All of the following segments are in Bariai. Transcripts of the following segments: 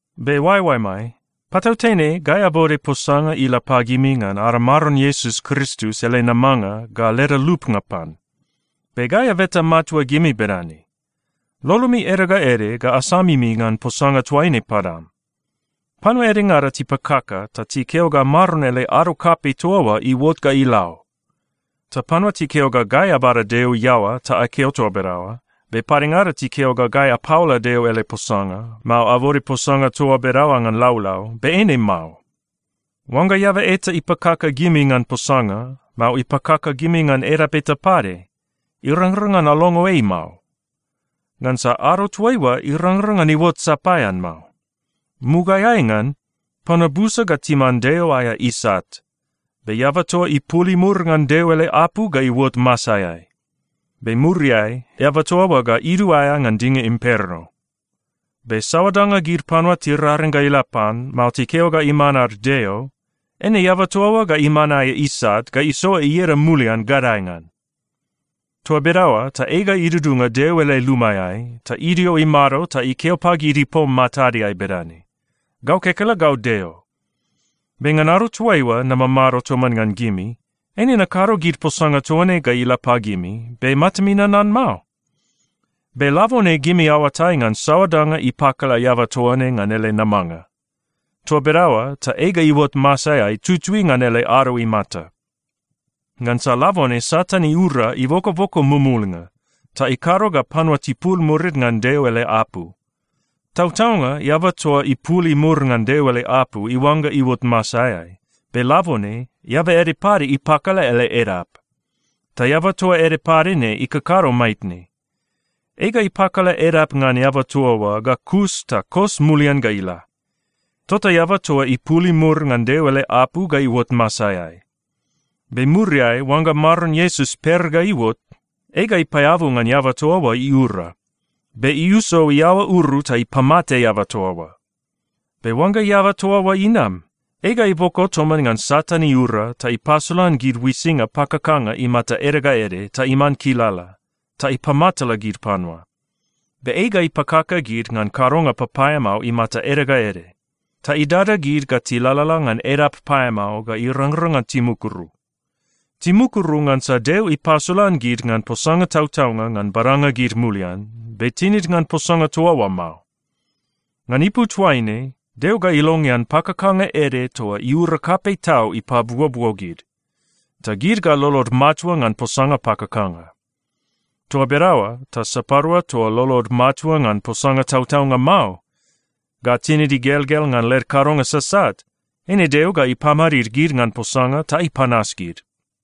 Be oaeoaemai, patautene gai abode posanga ila pagimi ngan ada Maron Iesus Kristus ele namanga ga leda lupnga pan. Be gai abeta matua gimi bedane: Lolomi ede ga ede ga asamimi ngan posanga toaine padam. Panua edengada tipakaka ta tikeo ga Maron ele ado kapei toa oa iuot ga ila o. Ta panua tikeo ga gai abada Deo iaoa ta akeo toa bedaoa, be padengada tikeo ga gai apaola Deo ele posanga, mao abode posanga toa bedaoa ngan laulau, be eine mao. Oangga eaba eta ipakaka gimi ngan posanga, mao ipakaka gimi ngan edap eta pade, irangrang ngan alongo ei mao. Ngansa ado toaiua irangrang ngan iuot sapaean mao. Mugaeai ngan, panua busa ga timan Deo aea isat, be eaba toa ipul imur ngan Deo ele apu ga iuot masaeai. Be muriai, eaba toa oa ga iduaea ngan dinga imperno. Be saoa danga gid panua tiraring ga ila pan, mao tikeo ga iman ad deo, eine eaba toa oa ga iman aea isat ga isoa ieda mulian gadae ngan. Toa bedaoa ta ei ga idudunga Deo ele lumaeai ta idio imado ta ikeo pagid ipom matadeai bedane, “Gau kekelegau Deo.” Be ngan ado toaiua namamado toman ngan gimi, eine nakado gid posanga toa ne ga ila pagimi, be matami nanan mao? Be labone gimi aoatai ngan saoa danga ipakala eaba toa ne ngan ele namanga. Toa bedaoa ta ei ga iuot masaeai tutui ngan ele ado imata. Ngansa labone Satan iura ibokoboko mumulnga, ta ikado ga panua tipul murid ngan Deo ele apu. Tautaunga eaba toa ipul imur ngan Deo ele apu iuangga iuot masaeai, be labone eaba ede pade ipakala ele edap. Ta eaba toa ede pade ne ikakado maitne. Ei ga ipakala edap ngan eaba toa oa, ga kus ta kos mulian ga ila. Tota eaba toa ipul imur ngan Deo ele apu ga iuot masaeai. Be muriai, oangga Maron Iesus per ga iuot, ei ga ipaeabu ngan eaba toa oa iura, be iuso iaoa uru ta ipamate eaba toa oa. Be oangga eaba toa oa inam, ei ga iboko toman ngan Satan iura ta ipasolan gid uisinga pakakanga imata ede ga ede ta iman kilala, ta ipamatala gid panua. Be ei ga ipakaka gid ngan kadonga papaeamao imata ede ga ede. Ta idada gid ga tilalala ngan edap paeamao ga irangrang ngan timukuru. Timukuru ngansa Deo ipasolan gid ngan posanga tautaunga ngan badanga gid mulian, be tinid ngan posanga toa oa mao. Ngan ipu toaine, Deo ga ilongean pakakanga ede toa iura kapei tau ipabuobuo gid, ta gid ga lolod matua ngan posanga pakakanga. Toa bedaoa ta sapadua toa lolod matua ngan posanga tautaunga mao, ga tinid igelgel ngan led kadonga sasat, eine Deo ga ipamadid gid ngan posanga ta ipanas gid.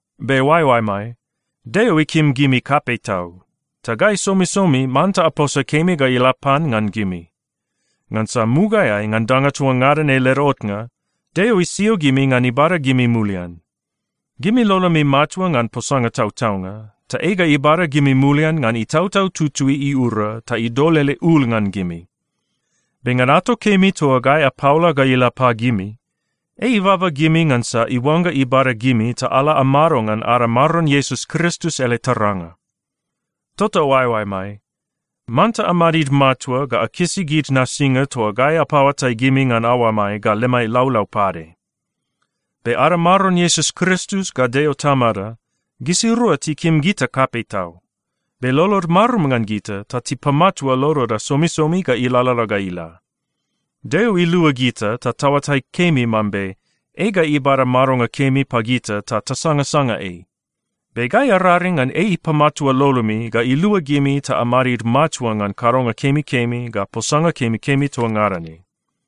Be oaeoaemai, Deo ikim gimi kapei tau, ta gai somisomi manta aposa kemi ga ila pan ngan gimi, ngansa mugaeai ngan danga toa ngada ne led otnga, Deo isio gimi ngan ibada gimi mulian. Gimi lolomi matua ngan posanga tautaunga, ta ei ga ibada gimi mulian ngan Itautau Tutui iura ta idol ele ul ngan gimi. Be ngan ato kemi toa gai apaola ga ila pagimi, ei ibaba gimi ngansa iuangga ibada gimi ta ala amado ngan ada Maron Iesus Kristus ele taranga. Tota oaeoaemai, manta amadid matua ga akisi gid nasinga toa gai apaoatai pagimi ngan aoamai ga lemai laulau pade. Be ada Maron Iesus Kristus ga Deo Tamada, gisirua tikim gita kapei tau. Be lolod marum ngan gita ta tipamatua loloda somisomi ga ilalala ga ila. Deo ilua gita ta taoatai kemi mambe ei ga ibada madonga kemi pagita ta tasangasanga ei. Be gai araring ngan ei ipamatua lolomi ga ilua gimi ta amadid matua ngan kadonga kemikemi ga posanga kemikemi toa ngada ne.